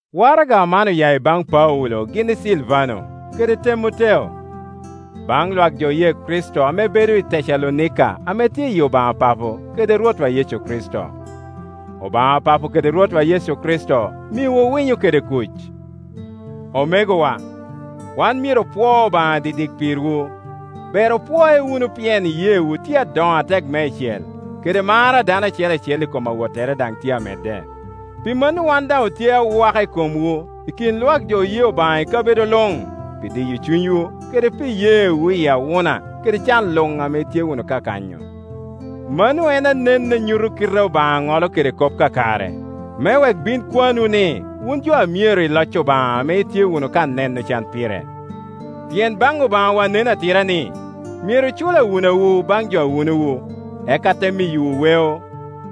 Waraga man oya i baŋ Paulo gin i Silvano, kede Temoteo. Baŋ lwak jo oye Kricito ame bedo i Tecalonika ame tye i Obaŋa Papo kede Rwotwa Yecu Kricito. Obaŋa Papo kede Rwotwa Yecu Kricito miwu winyo kede kuc. Omegowa, wan myero opwo Obaŋa didik pirwu. Ber opwoe wunu pien iyeewu tye adoŋo atek meicel, kede mar a dano acel acel i kom awottere daŋ tye amedde. Pi mano wan daŋ otye awaka i komwu i kin lwak jo oye Obaŋa i kabedo luŋ, pi diyo cunywu kede pi iyeewu i awuna kede can luŋ ame itye wunu ka kanyo. Mano en anen a nyuto kite ame Obaŋa ŋolo kede kop kakare, me wek bin kwanwu ni wun jo a myero i loc Obaŋa ame itye wunu ka neno can pire. Pien baŋ Obaŋawa nen atira ni, myero cul awunawu baŋ jo awunowu, eka te miyowu weo,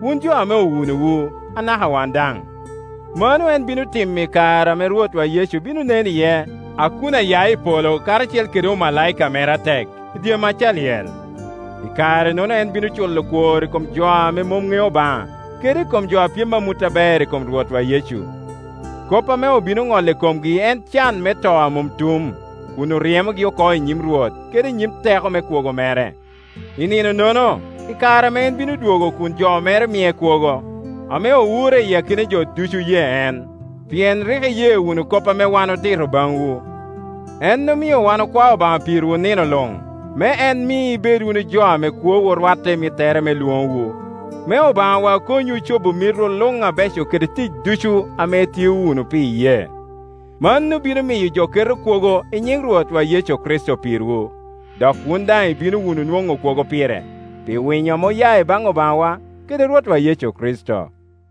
wun jo ame owunowu, anaka wan daŋ. Mano en bino timo i kare ame Rwot Yecu bino nen iye a kun aya i polo karacel kede omalaika mere atek i dye mac a lyel. I kare-nono en bino culo kwor i kom jo ame mom ŋeo Obaŋa kede i kom jo a pyem amut aber i kom Rwotwa Yecu. Kop ame obino ŋolo i komgi en can me to a mom tum, kun oryemogi oko i nyim Rwot kede i nyim teko me kwogo mere, i nino-nono, i kare ame en bino dwogo kun jo mere mie kwogo, ame owure i akina jo ducu oye en; pien rik iye wunu kop ame wan otito baŋwu. En omio wan okwao Obaŋa pirwu nino luŋ, me en mi ibed wunu jo a kwowu rwatte i mittere me lwoŋowu, me Obaŋawa konywu cobo mitwu luŋ abeco kede tic ducu ame itio wunu pi iyee. Mano bino miyo jo keto kwogo i nyiŋ Rwotwa Yecu Kricito pirwu, dok wun daŋ ibino wunu nwoŋo kwogo pire, pi winyo ame oya i baŋ Obaŋawa kede Rwotwa Yecu Kricito.